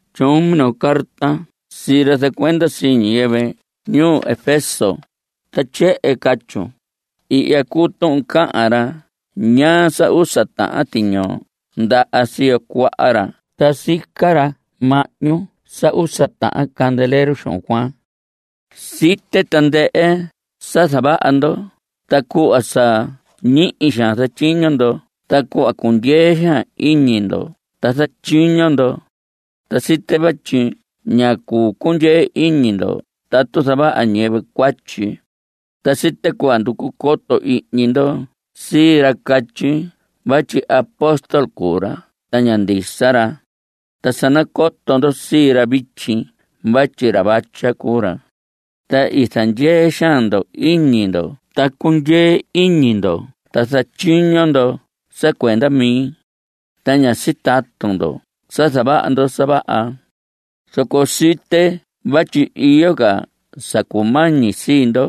Tyoon minoo carta sii ra zacuenda sii ñiyɨvɨ ñuu Efeso, ta tyehen catyun: “Ihya cuu tuhun cahan ra ñaa sa usa tahan tiñoo ndaha siyo cuaha ra ta sica ra mahñu sa usa tahan candelero xuhun cuaan. Site tandɨhɨ sa zavaha ndo ta cuhva sa ñihi xaan zatyiño ndo ta cuhva cundyee xaan iñi ndo ta zatyiño ndo. Ta site vatyi ña cuu cundyee iñi ndo tatu zavaha ñiyɨvɨ cuatyi. Ta site cuhva nducu coto ihñi ndo sii ra catyi vatyi apóstol cuu ra ta ña ndisa ra. Ta sa nacoto ndo sii ra vityi vatyi ra vatya cuu ra. Ta i zandyee xaan ndo iñi ndo ta cundyee iñi ndo ta zatyiño ndo sa cuenda mi. Ta ña sitatu ndo sa zavaha ndo sa vaha. Zoco site vatyi iyo ca sa cumañi sii ndo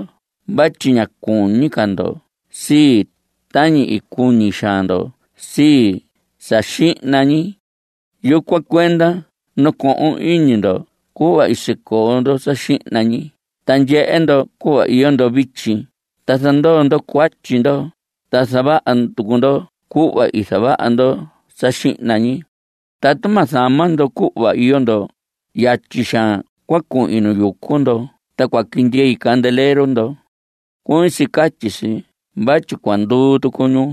vatyi ña cuñi ca ndo sii, tañi i cuñi xaan ndo sii, sa xihna ñi. Yucuan cuenda nacohon iñi ndo cuhva i sicoo ndo sa xihna ñi ta ndyehe ndo cuhva iyo ndo vityi ta zandoo ndo cuatyi ndo, ta zavaha tucu ndo cuhva i zavaha ndo sa xihna ñi. Tatu ma zama ndo cuhva iyo ndo, yatyi xaan cua cuhin nu yucu ndo ta cua quindyei candelero ndo. (Cuñi si catyi si vatyi cua nduu tucu ñu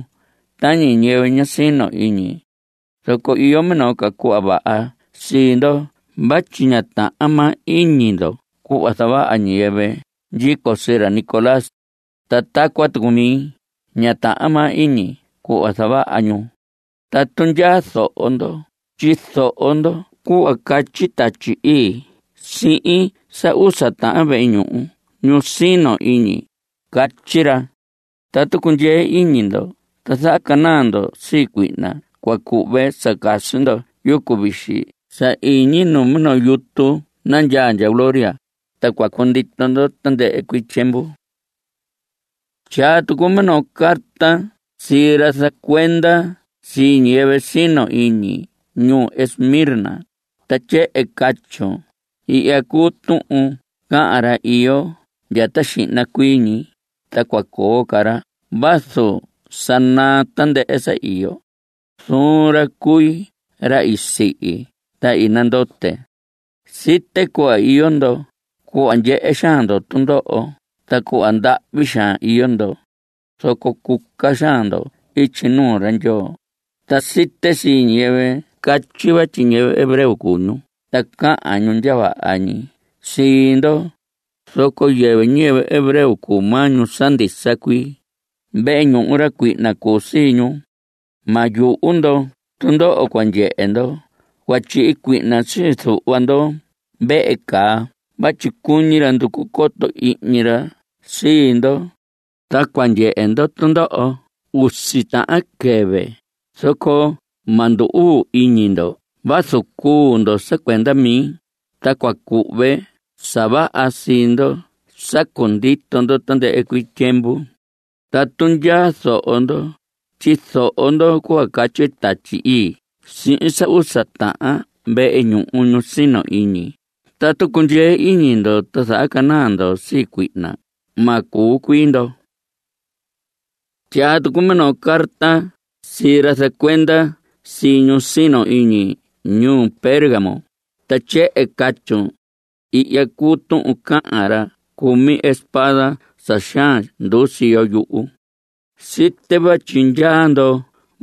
tañi ñiyɨvɨ ña sino iñi.) Zoco iyo minoo cuhva vaha sii ndo vatyi ña tahan maa iñi ndo cuhva zavaha ñiyɨvɨ ndyico sii ra Nicolás. Ta tacuan tucu mi. Ña tahan maa iñi cuhva zavaha ñu. Tatu ndyaa zoho ndo tyizoho ndo cuhva catyi Tatyi Ii sihin sa usa tahan vehe ñuhu ñu sino iñi. Catyi ra: Tatu cundyee iñi ndo ta zahacanaa ndo (sii cuihna) cua cuhve sa casi ndo yucu vixi sa iñi nu minoo yutu nandyaa ndya gloria, ta cua cundito ndo tandɨhɨ cuii tyiemvu.” Tyaa tucun minoo carta sii ra zacuenda sii ñiyɨvɨ sino iñi ñuu Esmirna, ta tyehen catyun: “Ihya cuu tuhun cahan ra iyo ndya ta xihna cuii ñi, ta cua coo ca ra vazu sa naa tandɨhɨ sa iyo. Zuun ra cui ra i sihi ta i nandote. Site cuhva iyo ndo. Cuhva ndyehe xaan ndo tundoho ta cuhva ndahvi xaan iyo ndo. Zoco cuca xaan ndo ityi nuu ra Ndyoo. Ta site sii ñiyɨvɨ catyi vatyi ñiyɨvɨ hebreo cuu ñu, ta cahan ñu ndya vaha ñi sii ndo, zoco yɨvɨ ñiyɨvɨ hebreo cuu maa ñu sa ndisa cuii. Vehe ñuhu ra cuihna cuu sii ñu. Ma yuhu ndo tundoho cua ndyehe ndo. Cua tyihi cuihna sii zuhva ndo vehe caa vatyi cuñi ra nducu coto ihñi ra sii ndo. Ta cua ndyehe ndo tundoho usi tahan quɨvɨ, zoco ma ndu‑uu iñi ndo vazu cuu ndo sa cuenda mi, ta cua cuhve sa vaha sii ndo sa cundito ndo tandɨhɨ cuii tyiemvu. Tatu ndyaa zoho ndo, tyizoho ndo cuhva catyi Tatyi Ii sihin sa usa tahan vehe ñuhu ñu sino iñi: Tatu cundyee iñi ndo ta zahacanaa ndo sii cuihna, ma cuu cuii ndo.” Tyaa tucun minoo carta sii ra zacuenda sii ñu sino iñi ñuu Pérgamo, ta tyehen catyun: “Ihya cuu tuhun cahan ra cumi espada sa xaan nduu siyo yuhu. Site vatyi ndyaa ndo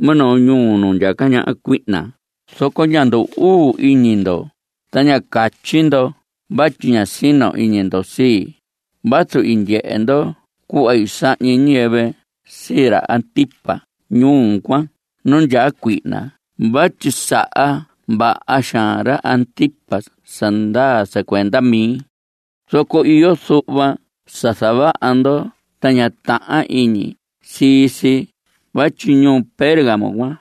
minoo ñuu nu ndyaca ñaha cuihna, zoco ña ndu‑uu iñi ndo, ta ña catyi ndo vatyi ña sino iñi ndo sii, vazu i ndyehe ndo cuhva i sahñi ñiyɨvɨ sii ra Antipas ñuu cuan nu ndyaa cuihna vatyi saha vaha xaan ra Antipas sa ndaa sa cuenda mi. Zoco iyo zuhva sa zavaha ndo ta ña tahan iñi sii si vatyi ñuu Pérgamo cuan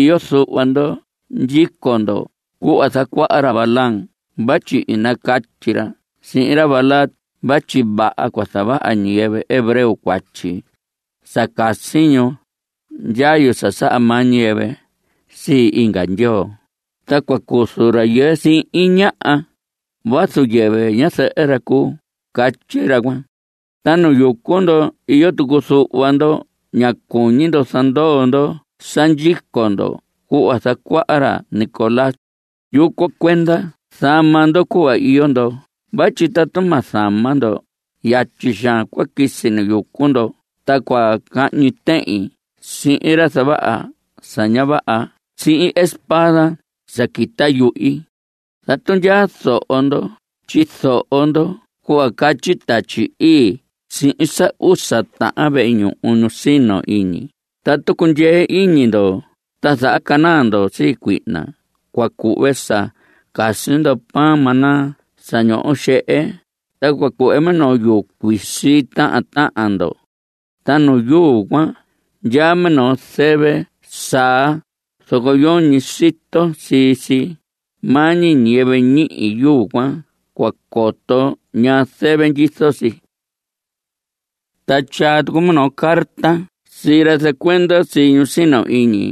iyo zuhva ndo ndyico ca ndo cuhva i zacuaha ra Balaam vatyi i nacatyi ra sihin ra Balac vatyi vaha cua zavaha ñiyɨvɨ hebreo cuatyi sa casi ñu ndyayu sa saha maa ñiyɨvɨ sii inga ndyoo ta cua cuzu rayɨɨ sihin ñaha vazu yɨvɨ ñazɨhɨ ra cuu, catyi ra cuan. Ta nu yucu ndo iyo tucu zuhva ndo ña cuñi ndo zandoo ndo sa ndyico ndo cuhva zacuaha ra Nicolás. Yucuan cuenda zama ndo cuhva iyo ndo vatyi tatu ma zama ndo, yatyi xaan cua quisi nu yucu ndo ta cua cahñi tehin sihin ra zavaha sa ña vaha sihin espada sa quita yuhi. Tatu ndyaa zoho ndo tyizoho ndo cuhva catyi Tatyi Ii sihin sa usa tahan vehe ñuhu ñu sino iñi: Tatu cundyee iñi ndo ta zahacanaa ndo sii cuihna cua cuhve sa casi ndo pan maná sa ñoho xehe, ta cua cuhve minoo yuu cuisi sii tahan tahan ndo. Ta nu yuu cuan ndyaa minoo zɨvɨ saa, zoco yoñi sito sii si. Maa ñi ñiyɨvɨ ñihi yuu cuan cua coto ñaa zɨvɨ ndyizo si.” Ta tyaa tucun minoo carta sii ra zacuenda sii ñu sino iñi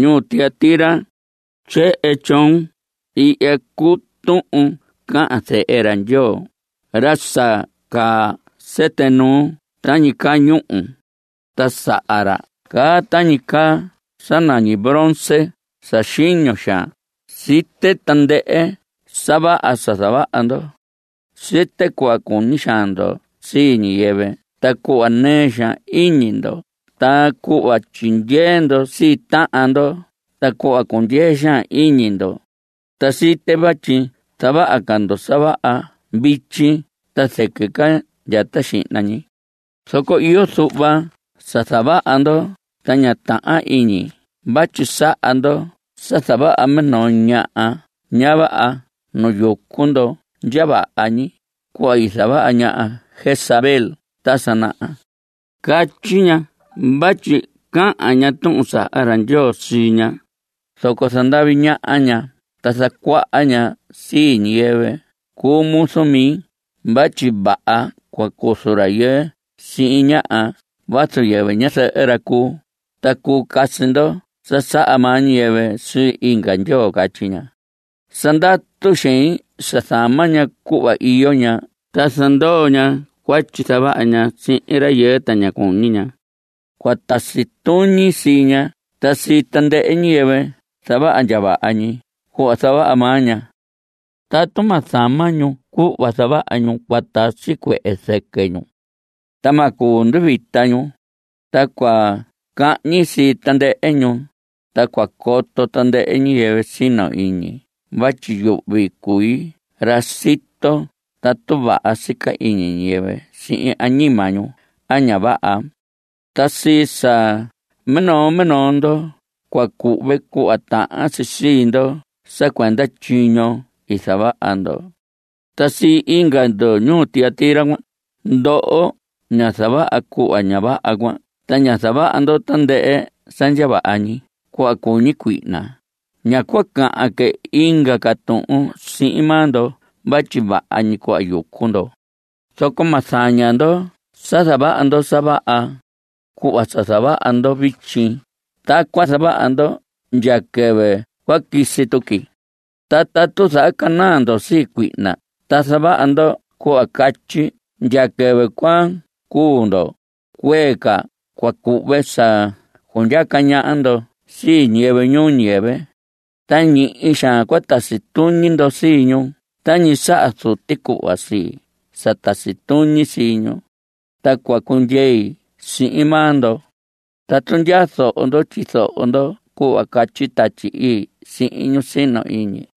ñuu Tiatira. Tyehen tyoon: “Ihya cuu tuhun cahan zehe ra Ndyoo, ra sa caa sɨtɨ nuu tañi caa ñúhu. Ta saha ra caa tañi caa sa nañi bronce sa xiño xaan. Site tandɨhɨ sa vaha sa zavaha ndo. Site cuhva cuñi xaan ndo sii ñiyɨvɨ ta cuhva nɨɨ xaan iñi ndo ta cuhva tyindyee ndo sii tahan ndo ta cuhva cundyee xaan iñi ndo. Ta site vatyi zavaha ca ndo sa vaha vityi ta zɨquɨ ndya ta xihna ñi. Zoco iyo zuhva sa zavaha ndo ta ña tahan iñi vatyi saha ndo sa zavaha minoo ñaha ña vaha nu yucu ndo ndya vaha ñi, cuhva i zavaha ña Jezabel ta sa naha. Catyi ña vatyi cahan ña tuhun saha ra Ndyoo sii ña, zoco zandavi ñaha ña ta zacuaha ña sii ñiyɨvɨ cuu muzu mi vatyi vaha cua cuzu rayɨɨ sihin ñaha vazu yɨvɨ ñazɨhɨ ra cuu, ta cuu casi ndo sa saha maa ñiyɨvɨ sii inga ndyoo, catyi ña. Sa ndatu xein sa zama ña cuhva iyo ña ta zandoo ña cuatyi zavaha ña sihin rayɨɨ, ta ña cuñi ña. Cua tasi tuñi sii ña ta sii tandɨhɨ ñiyɨvɨ zavaha ndya vaha ñi cuhva zavaha maa ña. Tatu ma zama ñu cuhva zavaha ñu cua tasi cuehe zɨquɨ ñu, ta ma cuu nduvita ñu. Ta cua cahñi sii tandɨhɨ ñu. Ta cua coto tandɨhɨ ñiyɨvɨ sino iñi vatyi yuhvi cui ra sito tatu vaha sica iñi ñiyɨvɨ sihin añima ñu a ña vaha. Ta sii sa minoo minoo ndo cua cuhve cuhva tahan si sii ndo sa cuenda tyiño i zavaha ndo. Ta sii inga ndo ñuu Tiatira, ndoho ña zavaha cuhva ña vaha cuan ta ña zavaha ndo tandɨhɨ sa ndya vaha ñi cuhva cuñi cuihna, ña cua cahan que inga ca tuhun sihin maa ndo vatyi vaha ñi cuhva yucu ndo. Zoco ma zaña ndo sa zavaha ndo sa vaha. Cuhva sa zavaha ndo vityi, tacuan zavaha ndo ndya quɨvɨ cua quisi tuqui. Ta tatu zahacanaa ndo sii cuihna ta zavaha ndo cuhva catyi ndya quɨvɨ cua cuu ndo, cuee ca cua cuhve sa cundyaca ñaha ndo sii ñiyɨvɨ ñuu ñiyɨvɨ. Ta ñihi xaan cua tasi tuñi ndo sii ñu tañi saha Zuti cuhva sii, sa tasi tuñi sii ñu. Ta cua cundyei sihin maa ndo. Tatu ndyaa zoho ndo, tyizoho ndo cuhva catyi Tatyi Ii sihin ñu sino iñi.”